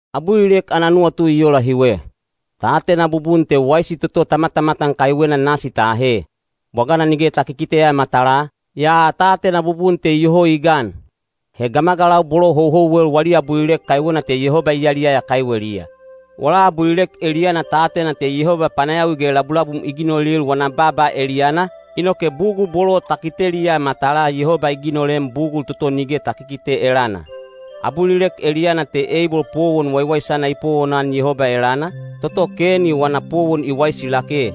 Abulilek ana nuwatu i ola hiwe. Ta atena bubun te waisi toto ta matamatan kaiwena nasi ta ahe. Bwagana nige ta kikiteya matalaa, yaa ta atena bubun te iyoho i gan. He gamagalau bolo houhouwel wali abulilek kaiwena te Yehoba i yaliyaya kaiweliya. Wala abulilek eliyana ta atena te Yehoba panayawi ge labulabum i ginolil wana baaba eliyana, inoke bugul bolo ta kiteliya matalaa Yehoba i ginolem bugul toto nige ta kikite elana. Abulilek eliyana te Eibol powon waiwaisana i powonan Yehoba elana, toto Keni wana powon i waisi lake.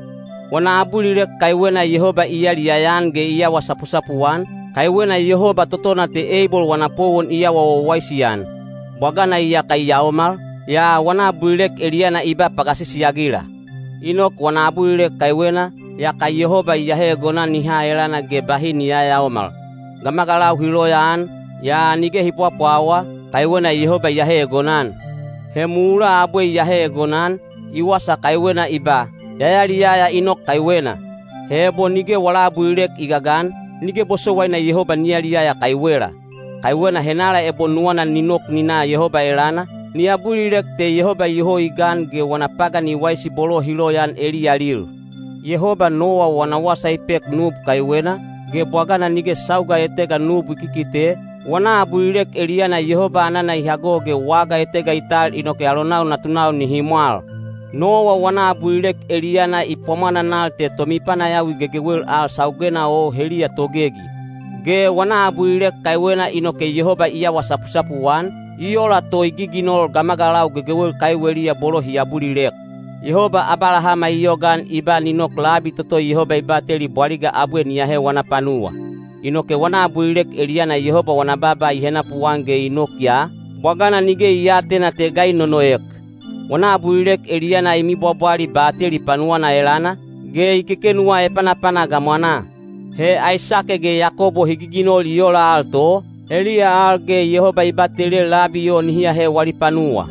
Wana abulilek kaiwena Yehoba i yaliyaya-an ge i awa sapusapu-an, kaiwena Yehoba totona te Eibol wana powon i awa wawaisi-an. Bwagana iyaka i yaomal, yaa wana abulilek eliyana i ba pagasisi-agila. Inok wana abulilek kaiwena, yaka Yehoba i ahe egonan i ha elana ge bahi ni yayaomal. Gamagalau hi loyaan, yaa nige hi pwapwawa, kaiwena Yehoba i ahe egonan. He mulaa abwe i ahe egonan, i wasa kaiwena i ba, “Ya yaliyaya Inok kaiwena.” He ebo nige wala abulilek i gagan, nige bosowaina Yehoba ni yaliyaya kaiwela. Kaiwena henala ebo nuwana ni nok ni na Yehoba elana, ni abulilek te Yehoba iyoho i gan ge wana pagan i waisi bolo hi loyaan eliyalil. Yehoba Nowa wana wasa i pek nub kaiwena, ge bwagana nige sauga etega nub i kikite, wana abulilek eliyana Yehoba anana i hago ge waga etega i tal inoke alonau natunau nihi mwal. Nowa wana abulilek eliyana i pwamwananal te tomipanayawi gegewel al saugena o heliya togegi. Ge wana abulilek kaiwena inoke Yehoba i awa sapusapu-an, i ola to i giginol gamagalau gegewel kaiweliya bolo hi abulilek. Yehoba Abalahama i yogaan i ba ni nok labi toto Yehoba i bateli bwaliga abwe ni ahe wana panuwa. Inoke wana abulilek eliyana Yehoba wana baaba i henapuan ge i nok ya, bwagana nige i aatena te ga i nonoek. Wana abulilek eliyana i mibwabwali bateli panuwana elana, ge i kekenuwa epanapana gamwanaa. He Aisake ge Yakobo hi giginol i ola al to, heliya al ge Yehoba i batelel labi o nihi ahe wali panuwa.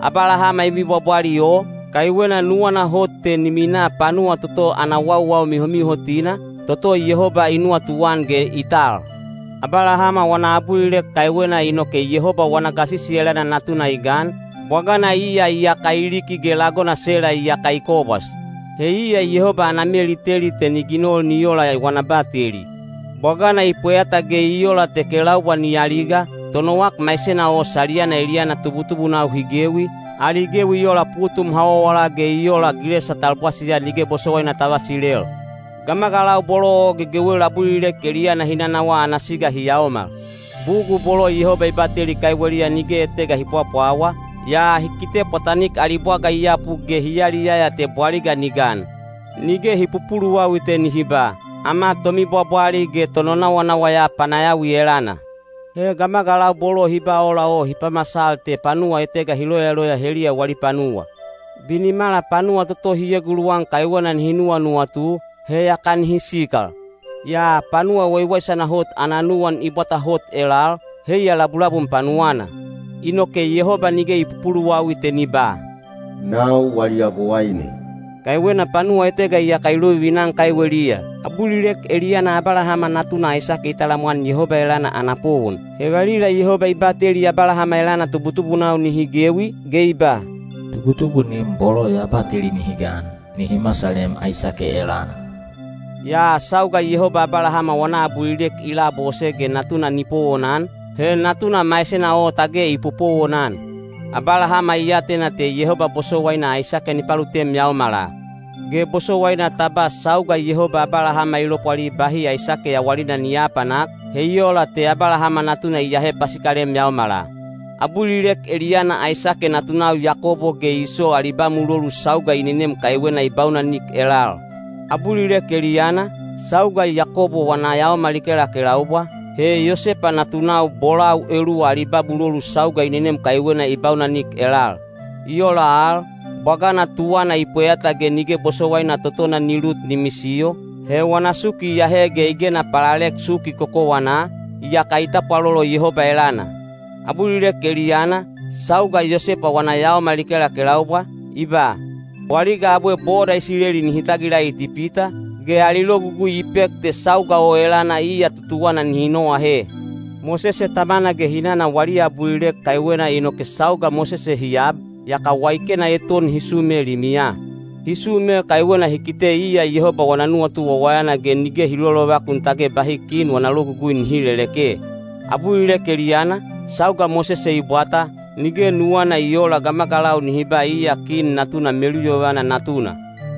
Abalahama i mibwabwali o, kaiwena nuwana hot te ni minaa panuwa toto ana wauwau mihomihotina, toto Yehoba i nuwatuan ge i tal. Abalahama wana abulilek kaiwena inoke Yehoba wana gasisi elana natuna i gan, bwagana iya iyaka i liki ge lagona Sela iyaka i kobwas. He iya Yehoba ana mel i teli te ni ginol ni ola wana bateli. Bwagana i pweyata ge i ola te kelaubwa ni aliga, tonowak maisena o saliyana eliyana tubutubunau hi gewi, ali gewi i ola putum hawawala ge i ola gilesa talbwasiya nige bosowaina ta vasilel. Gamagalau bolo o gegewel abulilek eliyana hi nanawaa ana siga hi yaomal. Bugul bolo Yehoba i bateli kaiweliya nige etega hi pwapwawa, yaa hi kite pwatanik ali bwaga i yapu ge hi yaliyaya te bwaliga ni gan. Nige hi pupuluwawi te nihi ba, “Ama tomibwabwali ge tononawanawa ya panayawi elana.” He gamagalau bolo hi ba ola o hi pamasal te panuwa etega hi loyaloya heliya wali panuwa. Binimala panuwa toto hi eguluwan kaiwena nihi nuwanuwatu, he yaka nihi sikal. Yaa panuwa waiwaisana hot ana nuwan i bwata hot elal, heiya labulabum panuwana. Inoke Yehoba nige i pupuluwawi te ni ba, “Nau wali Yabowaine,” kaiwena panuwa etega iyaka i lovivina-an kaiweliya. Abulilek eliyana Abalahama natuna Aisake i talamwan Yehoba elana ana powon. He valila Yehoba i bateli Abalahama elana tubutubunau nihi gewi, ge i ba, “Tubutubunim bolo ya bateli nihi gan, nihi masalem Aisake elana.” Yaa sauga Yehoba Abalahama wana abulilek i labose ge natuna ni powonan, he natuna maisena o tage i popowonan. Abalahama i atena te Yehoba bosowaina Aisake ni palutem yaomala. Ge bosowaina ta ba sauga Yehoba Abalahama i lopwali bahi Aisake yawalina ni aapanak, he i ola te Abalahama natuna i aahe pasikalem yaomala. Abulilek eliyana Aisake natunau Yakobo ge Iso ali ba mulolu sauga i nenem kaiwena i baunanik elal. Abulilek eliyana, sauga Yakobo wana yaomal i kelakelaubwa, he Yosepa natunau bolau eluwa ali ba mulolu sauga i nenem kaiwena i baunanik elal. I ola al, bwagana tuwana i pweyata ge nige bosowaina totona ni lut ni misiyo, he wana suki i ahe ge i gena palalek suki kokowanaa, yaka i tapwalolo Yehoba elana. Abulilek eliyana, sauga Yosepa wana yaomal i kelakelaubwa, i ba, “Bwaliga abwe boda Isileli nihi tagila Itipita,” ge ali logugui i pek te sauga o elana iya tutuwana nihi noahe. Mosese tamana ge hinana wali abulilek kaiwena inoke sauga Mosese hi ab, yaka waikena eton hi sume limiya. Hi sume kaiwena hi kite iya Yehoba wana nuwatu wawayana ge nige hi lolovakun tage bahi kin wana logugui nihi leleke. Abulilek eliyana, sauga Mosese i bwata, nige nuwana i oola gamagalau nihi ba iya kin natuna meluyovana natuna.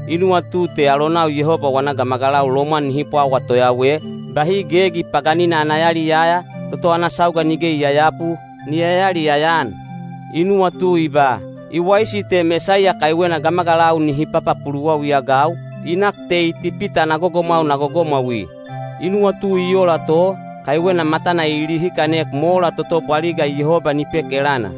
I nuwatu te alonau Yehoba wana gamagalau lomwan nihi pwawa toyawe, bahi gegi paganina ana yaliyaya, toto ana sauga nige i yayapu, ni yayaliyaya-an. I nuwatu i ba, “I waisi te Mesaiya kaiwena gamagalau nihi papapuluwawi-agau, i nak te Itipita ana gogomwau na gogomwaui.” I nuwatu i ola to, kaiwena matana i lihikanek mola toto bwaliga Yehoba ni pek elana.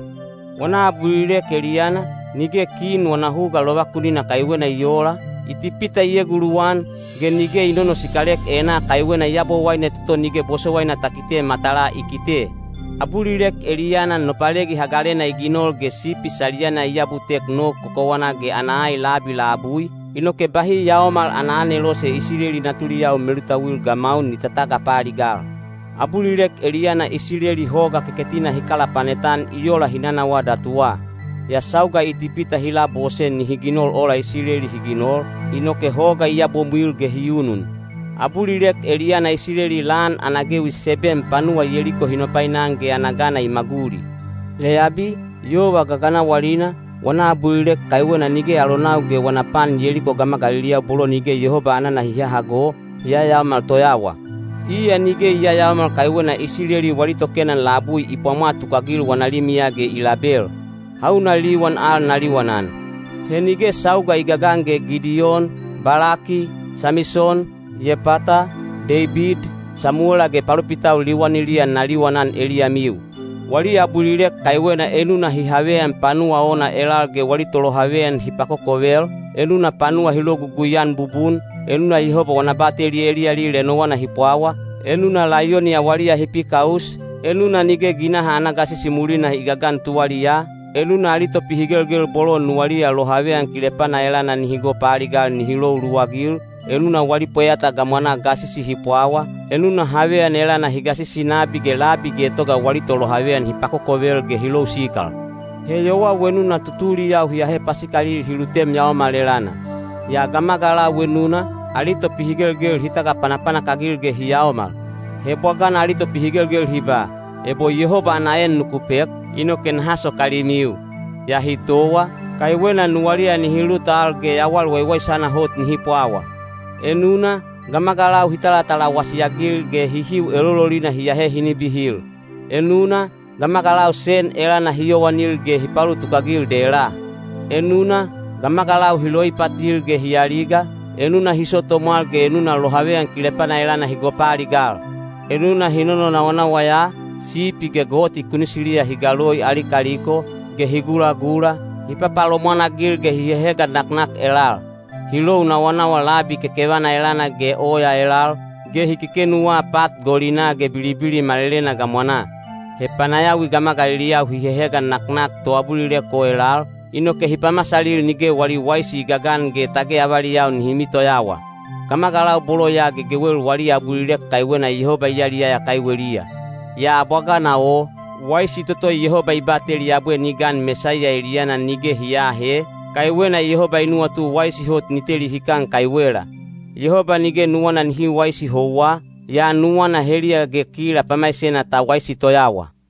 Wana abulilek eliyana, nige kin wana huga lovakunina kaiwena i oola, Itipita i eguluwan; ge nige i nonosikalek enaa kaiwena Yabowaine toto nige bosowaina ta kite matalaa i kite. Abulilek eliyana Nopalegi Hagalena i ginol ge sipi saliyana i abutek nog kokowanaa ge ana ai labi labui, inoke bahi Yaomal ana Anelose Isileli natuliyau melutauil gamaun ni tatagapaaligal. Abulilek eliyana Isileli Hoga Keketina hi kalapanet-an i ola hi nanawaa datuwa; yaa sauga Itipita hi labose nihi ginol ola Isileli hi ginol, inoke hoga i yabomwil ge hi unun. Abulilek eliyana Isileli lan ana gewi seben panuwa Yeliko hi nopainan ge ana gana i maguli. Leyabi, yova gaganawalina, wana abulilek kaiwena nige alonau ge wana pan Yeliko gamagaliliyau bolo nige Yehoba anana hi hahago, hi yayaomal toyawa. Iya nige i yayaomal kaiwena Isileli wali tokenan labui i pwamwa tukagil wana limiya ge i label. Hauna liwan al na liwanan? He nige sauga i gagan ge Gidiyon, Balaki, Samison, Yepata, Deibid, Samuwela ge palopitau liwaniliya na liwanan eliyamiu. Wali abulilek kaiwena enuna hi haveyan panuwa ona elal ge wali tolohaveyan hi pakokovel, enuna panuwa hi logugui-an bubun, enuna Yehoba wana bateli eliyalil enowana hi pwawa, enuna laiyoni awaliya hi pikaus, enuna nige ginaha ana gasisi mulina i gagan tuwaliyaa, enuna ali topihigelgel bolo nuwaliya lohaveyan kilepana elana nihi gopaaligal hi lou luwagil, enuna wali pweyata gamwanaa gasisi hi pwawa, enuna haveyan elana hi gasisi nabi ge labi getoga wali tolohaveyan hi pakokovel ge hi lou sikal. He yowau enuna tutuliyau hi ahe pasikalil hi lutem yaomal elana. Yaa gamagalau enuna, ali topihigelgel hi tagapanapanak-agil ge hi yaomal. He bwagana ali topihigelgel hi ba, “Ebo Yehoba ana en nuku pek, inoke naha sokalimiu,” yaa hi towa, kaiwena nuwaliya nihi lut al ge yawal waiwaisana hot nihi pwawa. Enuna, gamagalau hi talatalawasi-agil ge hihiu elololina hi ahe hi nibihil; enuna, gamagalau sen elana hi yowanil ge hi paulutuk-agil dela. Enuna, gamagalau hi loipatil ge hi aliga, enuna hi so tomwal ge enuna lohaveyan kilepana elana hi gopaaligal. Enuna hi nononawanawa ya, sipi ge goti kunisiliya hi galoi ali kaliko, ge hi gulagula, hi papalomwan-agil ge hi hehegan naknak elal. Hi lou nawanawa labi kekevana elana ge oya elal, ge hi kekenuwa pat golinaa ge bilibili malelena gamwanaa. He panayawi gamagaliliyau hi hehegan naknak toabulilek o elal, inoke hi pamasalil nige wali waisi i gagan ge tage avaliyau nihi mitoyawa. Gamagalau bolo ya gegewel wali abulilek kaiwena Yehoba i yaliyaya kaiweliya. Yaa bwagana o, waisi toto Yehoba i bateli abwe ni gan Mesaiya eliyana nige hi aahe, kaiwena Yehoba i nuwatu waisi hot ni teli hikan kaiwela. Yehoba nige nuwana nihi waisi houwa, yaa nuwana heliya ge kila pamaisena ta waisi toyawa.